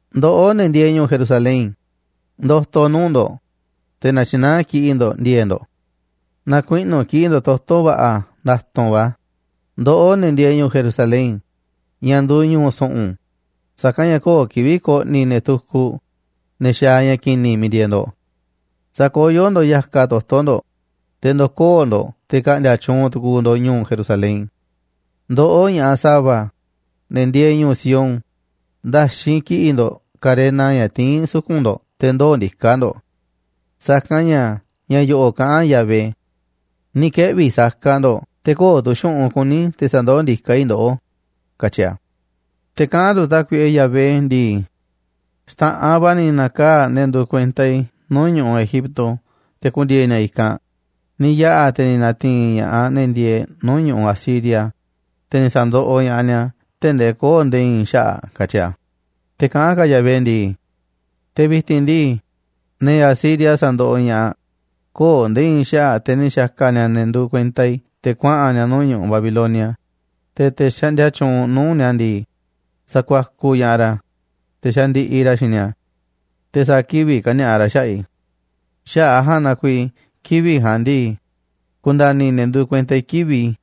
Ndoꞌó, ne̱ ndieeꞌ ñu̱u̱ Jerusalén, ndo̱to̱ nuu̱ꞌ ndo̱ꞌ, te̱ na̱tyi̱naá kiꞌi̱ꞌ ndo̱ꞌ ndi̱e̱e̱ꞌ ndo̱ꞌ. Na̱kuiꞌnu̱ kiꞌi̱ꞌ ndo̱ꞌ toto̱ va̱ꞌa̱ nda̱tu̱nꞌ va̱, ndoꞌó, ne̱ ndieeꞌ ñu̱u̱ Jerusalén, ña̱ nduuꞌ ñu̱u̱ su̱ꞌu̱n. Sa̱kanꞌ ña̱ köo̱ꞌ kivi̱ꞌ ko̱ꞌni̱ ne̱ tukuꞌ, ne̱ xaaꞌ ña̱ ki̱ni̱ miiꞌ ndieeꞌ ndo̱ꞌ. Sa̱koyó ndo̱ꞌ ya̱kaꞌ toto̱ ndo̱ꞌ, te̱ ndo̱koo̱ ndo̱ꞌ te̱ ka̱ꞌndi̱a̱ tyuunꞌ tu̱ku̱u̱ ndo̱ꞌ ñu̱u̱ Jerusalén. Ndoꞌó, ña̱ꞌaꞌ sa̱va̱, ne̱ ndieeꞌ ñu̱u̱ Sión, nda̱xinꞌ kiꞌi̱ꞌ ndo̱ꞌ karena ña̱ tiín suku̱nꞌ ndo̱ꞌ te̱ ndoo̱ ndiká ndo̱ꞌ. Sa̱kanꞌ ña̱ ña̱ yo̱ꞌo̱ꞌ kaꞌán Yahvé: “Ni̱ keꞌvi̱ saka ndo̱ꞌ, te̱ köo̱ꞌ tu̱ xu̱ꞌunꞌ kuní te̱ sa̱ndoó ndiká i̱ ndoꞌó”, katyi a̱. Te̱ kaꞌán tu̱ Tákuiꞌe Yahvé ndii: “Xta̱ꞌanꞌ va̱ ni̱ na̱kaa̱ꞌ ne̱ nduuꞌ kuenta i̱ nuu̱ꞌ ñu̱ꞌuꞌ Egipto te̱ ku̱ndi̱e̱e̱ ni̱a̱ i̱kanꞌ. Ni̱ yaꞌa̱ te̱ ni̱ na̱ti̱i̱n ña̱ꞌaꞌ ne̱ ndieeꞌ nuu̱ꞌ ñu̱ꞌuꞌ Asiria, te̱ ni̱ sa̱ndoꞌoꞌ ña̱ꞌaꞌ ni̱a̱ tee̱ꞌ ndee köo̱ꞌ nde̱e̱ i̱i̱n xaꞌa̱ꞌ”, katyi a̱. Te̱ kaꞌán ka̱ Yahvé ndii: “Te̱ vi̱ti̱n ndii, ne̱ Asiria sandoꞌoꞌ ña̱ꞌaꞌ, köo̱ꞌ nde̱e̱ i̱i̱n xaꞌa̱ꞌ, te̱ ni̱ xa̱ka̱ ni̱a̱ ne̱ nduuꞌ kuenta i̱ te̱ kuaꞌa̱n ni̱a̱ nuu̱ꞌ ñu̱ꞌuꞌ ja̱a̱nꞌ, te̱ te̱ xaꞌndia tyuunꞌ nuu̱ꞌ ni̱a̱ ndii, sakuakuꞌ ña̱ꞌaꞌ ra̱, te̱ xandiꞌiꞌ ra̱ xiinꞌ ni̱a̱. Te̱ sa̱a̱ kivi̱ꞌ kani̱a̱ꞌa ra̱ xaꞌa̱ꞌ i̱. Xaꞌa̱ꞌ a̱ ja̱a̱nꞌ na kuiiꞌ kivi̱ꞌ ja̱a̱nꞌ ndii, ku̱nda̱ni̱ ne̱ nduuꞌ kuenta i̱ kivi̱ꞌ i̱.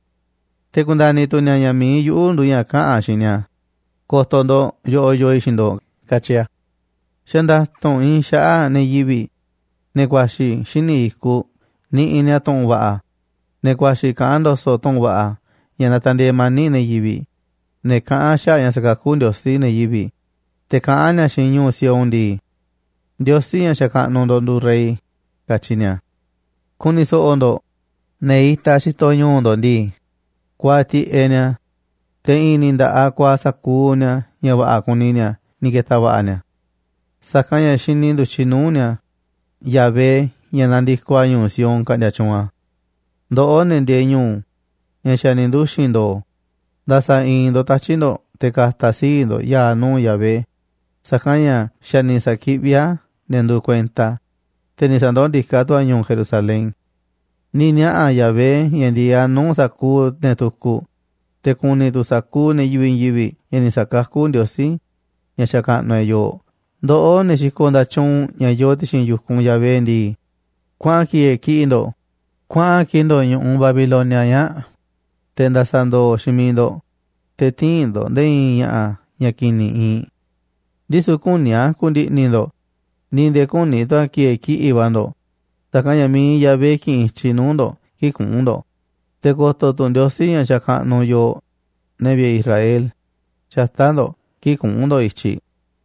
Te̱ ku̱nda̱ni̱ tu̱ ni̱a̱ ña̱ mi̱iꞌ yuꞌu̱ nduuꞌ ña̱ kaꞌa̱n xiinꞌ ni̱a̱. Ko̱to̱ ndo̱ꞌ, yoꞌoꞌ yoo i̱ xiinꞌ ndo̱ꞌ”, katyi a̱. Xa̱ nda̱tu̱nꞌ iinꞌ xaꞌa̱ꞌ ne̱ yivi̱ꞌ, ne̱ ku̱a̱xi̱ xíniꞌ i̱kuꞌ niꞌiꞌ ni̱a̱ tu̱ꞌu̱n va̱ꞌa̱, ne̱ ku̱a̱xi̱ kaꞌán ndo̱so̱ꞌ tu̱ꞌu̱n va̱ꞌa̱ ña̱ natandieeꞌ mani̱ꞌ ne̱ yivi̱ꞌ. Ne̱ kaꞌán xaꞌa̱ꞌ ña̱ sa̱kakú Ndiosí ne̱ yivi̱ꞌ, te̱ kaꞌán ni̱a̱ xiinꞌ ñu̱u̱ Sión ndii: “Ndiosí, ña̱ xakaꞌnuꞌ ndo̱ꞌ, nduuꞌ rey”, katyi ni̱a̱. Ku̱ni̱ so̱ꞌo̱ ndo̱ꞌ, ne̱ itaꞌ xitoꞌ ñu̱u̱ ndo̱ꞌ ndii, kuaaꞌ tiꞌeꞌ ni̱a̱, te̱ i̱i̱n ni̱ nda̱ꞌaꞌ kuaaꞌ sa̱kuuꞌ ni̱a̱ ña̱ va̱ꞌa̱ kuni ni̱a̱ ni̱ ke̱ta̱ va̱ꞌa̱ ni̱a̱. Sa̱kanꞌ ña̱ xini ndu̱tyiꞌ nuu̱ꞌ ni̱a̱ Yahvé ña̱ nandikoꞌ a̱ ñu̱u̱ Sión ka̱ꞌndi̱a̱ tyuunꞌ a̱. Ndoꞌó, ne̱ ndieeꞌ ñu̱u̱, ña̱ xa̱ ni̱ nduxi̱n ndo̱o̱, nda̱sa̱ i̱i̱n ndo̱ꞌ tatyi̱ꞌ ndo̱ꞌ te̱ ka̱ta̱ sii̱ꞌ ndo̱ꞌ ya̱a̱ nuu̱ꞌ Yahvé, sa̱kanꞌ ña̱ xa̱ ni̱ sa̱kiꞌví a̱ ne̱ nduuꞌ kuenta a̱, te̱ ni̱ sa̱ndoó ndiká tu̱ a̱ ñu̱u̱ Jerusalén. Ni̱ niaꞌa̱ Yahvé ña̱ ndi̱e̱eꞌ a̱ nuu̱ꞌ sa̱kuuꞌ ne̱ tukuꞌ, te̱ ku̱ni̱ tu̱ sa̱kuuꞌ ne̱ yivi̱ꞌ i̱i̱n yivi̱ꞌ ña̱ ni̱ sa̱kakú Ndiosí, ña̱ xakaꞌnuꞌ e̱ꞌ, yooꞌ. Ndoꞌó, ne̱ xikoꞌ nda̱tyuunꞌ ña̱ yoo ti̱xi̱n yu̱kunꞌ Yahvé ndii, kuaꞌan ki̱e̱e̱ kiꞌi̱ꞌ ndo̱ꞌ, kuaꞌa̱n kiꞌi̱ꞌ ndo̱ꞌ ñu̱ꞌuꞌ ñaa̱ꞌ, te̱ nda̱sa̱ ndo̱o̱ xiinꞌ miiꞌ ndo̱ꞌ, te̱ tï̱i̱n ndo̱ꞌ nde̱e̱ i̱i̱n ña̱ꞌa̱ ña̱ ki̱ni̱ iinꞌ. Ndisu̱ küní a̱ ku̱ndi̱ꞌni̱ ndo̱ꞌ, ni̱ nde̱e̱ küní tu̱ a̱ ki̱e̱e̱ kiꞌi̱ꞌ va̱ ndo̱ꞌ, sa̱kanꞌ ña̱ mi̱iꞌ Yahvé ki̱ꞌi̱n i̱tyiꞌ nuu̱ꞌ ndo̱ꞌ kii̱ꞌ kuꞌu̱n ndo̱ꞌ, te̱ ko̱to̱ tu̱ Ndiosí, ña̱ xakaꞌnuꞌ yooꞌ, ne̱ vi̱ꞌe̱ Israel, xata̱ꞌ ndo̱ꞌ kii̱ꞌ kuꞌu̱n ndo̱ꞌ i̱tyiꞌ.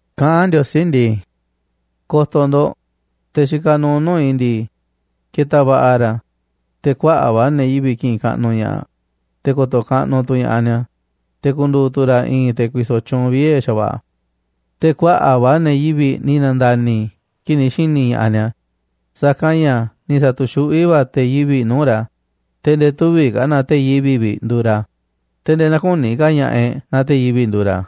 Kaꞌán Ndiosí ndii: “Ko̱to̱ ndo̱ꞌ, te̱ xikaꞌ nuuꞌ nuu̱ꞌ i̱ ndii, ke̱ta̱ va̱ꞌa̱ ra̱, te̱ kuaꞌa̱ꞌ va̱ ne̱ yivi̱ꞌ ki̱ꞌi̱n kaꞌnuꞌ ña̱ꞌaꞌ, te̱ ko̱to̱ kaꞌnuꞌ tu̱ ña̱ꞌaꞌ ni̱a̱, te̱ ku̱ndu̱u̱ tu̱ ra̱ i̱i̱n te̱ ku̱i̱so̱ tyuunꞌ viee̱ xa̱va̱ꞌa̱. Te̱ kuaꞌa̱ꞌ va̱ ne̱ yivi̱ꞌ ni̱ na̱nda̱ni̱ kii̱ꞌ ni̱ xi̱ni̱ ña̱ꞌaꞌ ni̱a̱, sa̱kanꞌ ña̱ ni̱ sa̱tu̱xuꞌví va̱ te̱ yivi̱ꞌ nuu̱ꞌ ra̱. Te̱ nde̱e̱ tüviꞌ ka̱ naaꞌ te̱ yivi̱ꞌ vi̱ꞌ nduuꞌ ra̱, te̱ nde̱e̱ näkuni ka̱ ña̱ꞌaꞌ e̱ꞌ naaꞌ te̱ yivi̱ꞌ nduuꞌ ra̱.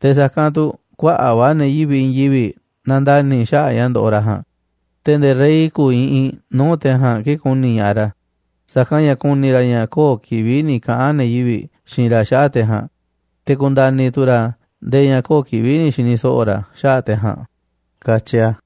Te̱ sa̱kanꞌ tu̱ kuaꞌa̱ꞌ va̱ ne̱ yivi̱ꞌ i̱i̱n yivi̱ꞌ na̱nda̱ni̱ xaꞌa̱ꞌ ña̱ ndoꞌoꞌ ra̱ ja̱a̱nꞌ. Te̱ nde̱e̱ rey ku̱u̱ iꞌinꞌ nuu̱ꞌ te̱ ja̱a̱nꞌ kii̱ꞌ ku̱ni̱ ña̱ꞌaꞌ ra̱, sa̱kanꞌ ña̱ ku̱ni̱ ra̱ ña̱ köo̱ꞌ kivi̱ꞌ ni̱ kaꞌa̱n ne̱ yivi̱ꞌ xiinꞌ ra̱ xaꞌa̱ꞌ te̱ ja̱a̱nꞌ. Te̱ ku̱nda̱ni̱ tu̱ ra̱ nde̱e̱ ña̱ köo̱ꞌ kivi̱ꞌ ni̱ xi̱ni̱ so̱ꞌo̱ ra̱ xaꞌa̱ꞌ te̱ ja̱a̱nꞌ”, katyi a̱.